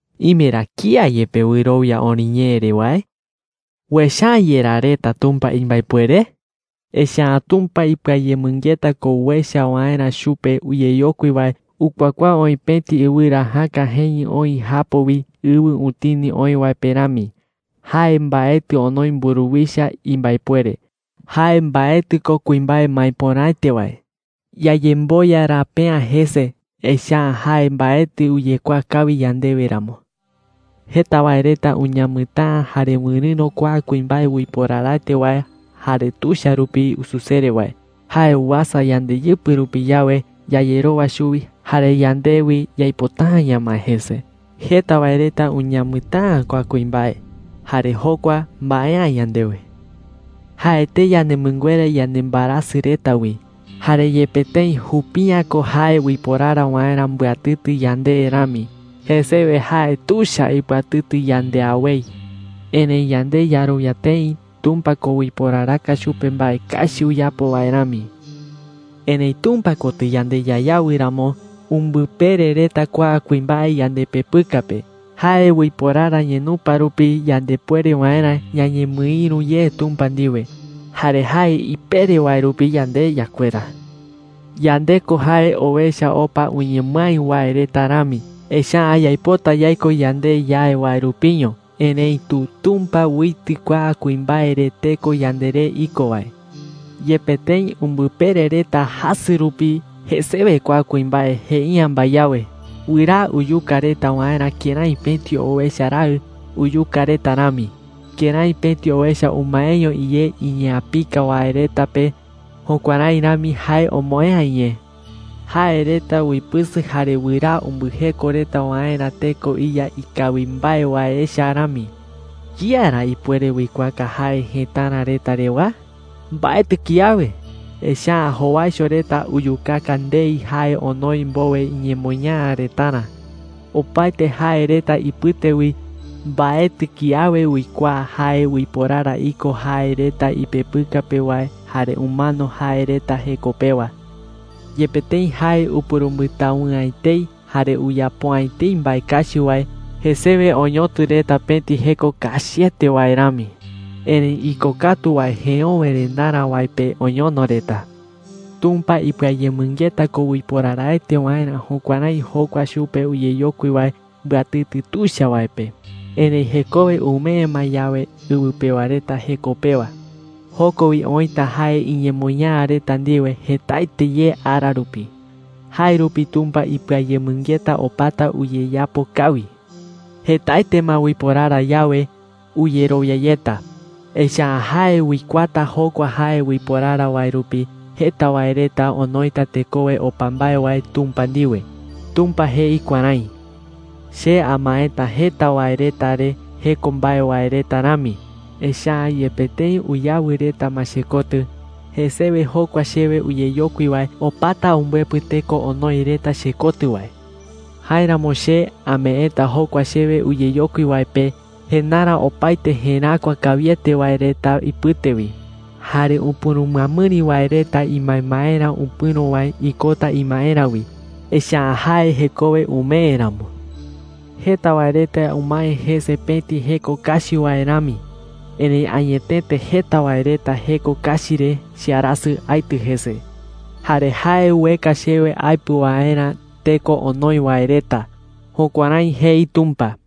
¿Ime ra kía yepe wɨrowia oriñee re wae? ¿Uecha’ä yerá reta Tumpa imbaepuere? Echa’ä Tumpa ipɨayemɨngeta ko uecha waerä chupe uyeyokui wae ukuakuaa oï pëti ɨwɨra jäka jeñɨ oï japo wi ɨwɨ utini oï wae pe rami. Jae mbaetɨ onoi mburuwicha imbaepuere. Jae mbaetɨ ko kuimbae maepöraete wae. Yayemboya rape’ä jese, echa’ä jae mbaetɨ uyekuaa kawi yandewe ramo. Jeta wae reta uñamɨtäa jare wɨrɨ̈ro kua kuimbae uiporaraete wae jare tuicha rupi ususere wae. Jae uasa yandeyɨpɨ rupi yawe, yayerowa chuwi jare yande wi yaipota’ä ñamae jese. Jeta wae reta uñamɨtäa kua kuimbae, jare jokua mbae’ä yandewe. Jae etei yanemɨnguera yanembaerasɨ reta wi. Jare yepe tëi jupi’ä ko jae uiporara waerä mbɨatɨtɨ yande rami, jesewe jae tuicha ipɨatɨtɨ yande awei. Erëi yande yarowia tëi Tumpa ko uiporaraka chupe mbae kachi uyapo wae rami. Erëi Tumpa kotɨ yande yayawɨ ramo, umbɨpere reta kua kuimbae yandepepɨka pe. Jae uiporara ñenupa rupi yandepuere waerä ñañemɨïru ye Tumpa ndiwe. Jare jae ipere wae rupi yande yakuera. Yande ko jae owecha opa uñemɨái wae reta rami, echa’ä yaipota yaiko yande yae wae rupiño. Erëitu Tumpa uitɨ kua kuimbae re teko yanderé iko wae. Yepe tëi umbɨpere reta jasɨ rupi, jesewe kua kuimbae jei’ä mbae awe. Wɨraa uyuka reta waerä jokua kuimbae kërái pëti owecha raɨ uyuka reta rami. Kërái pëti owecha umaeño iyé iñeapika wae reta pe, jukuärái rami jae omoë'ä iñee. Jae reta uipɨsɨ jare wɨraa umbɨjeko reta waerä teko iya ikawi mbae wae echa rami. ¿Kía ra ipuere uikuaaka jae jëtara reta rewa? Mbaetɨ kiawe, echa’ä jowaicho reta uyukaka ndei jae onoi mbowe iñemoñaa retarä. Opaete jae reta ipɨte wi, mbaetɨ kiawe uikuaa jae uiporara iko jae reta ipepɨka pe wae jare umano jae reta jeko pewa. Yepe tëi jae upurumbɨtawɨ'ä etei jare uyapo’ä etei mbae kachi wae, jesewe oñotɨ reta pëti jeko kachiete wae rami. Erëi ikokatu wae jeöwerendarä wae pe oñono reta. Tumpa ipɨayemɨngeta ko uiporaraete waerä jukuärái jokua chupe uyeyokui wae mbɨatɨtɨ tuicha wae pe. Erëi jekowe umee ma yawe ɨwɨ pewa reta jeko pewa, joko wi oïta jae iñemoñaa reta ndiwe jetaete ye ara rupi. Jae rupi Tumpa ipɨayemɨngeta opata uyeyapo kawi. Jetaete ma uiporara yawe, uyerowia yeta, echa’ä jae uikuaata jokua jae uiporara wae rupi jeta wae reta onoita tekowe opa mbae wae Tumpa ndiwe. Tumpa jei kuärái: “Che amaeta jeta wae reta re jeko mbae wae reta rami. Echa’ä yepe tëi uyawɨ reta ma chekotɨ, jesewe jokua chewe uyeyokui wae opata umbɨepɨ teko onoi reta chekotɨ wae. Jáeramo che ameeta jokua chewe uyeyokui wae pe jendarä opaete jeräkua kawiete wae reta ipɨte wi. Jare upurumɨamɨri wae reta imbaembaerä upɨ̈ro wae ikota imaerä wi, echa’ä jae jekowe umee ramo. Jeta wae reta umae jese pëti jeko kachi wae rami. Erëi añetete jeta wae reta jeko kachi re chearasɨ aitɨ jese. Jare jae ueka chewe aepɨ waerä teko onoi wae reta.” Jukuärái jei Tumpa.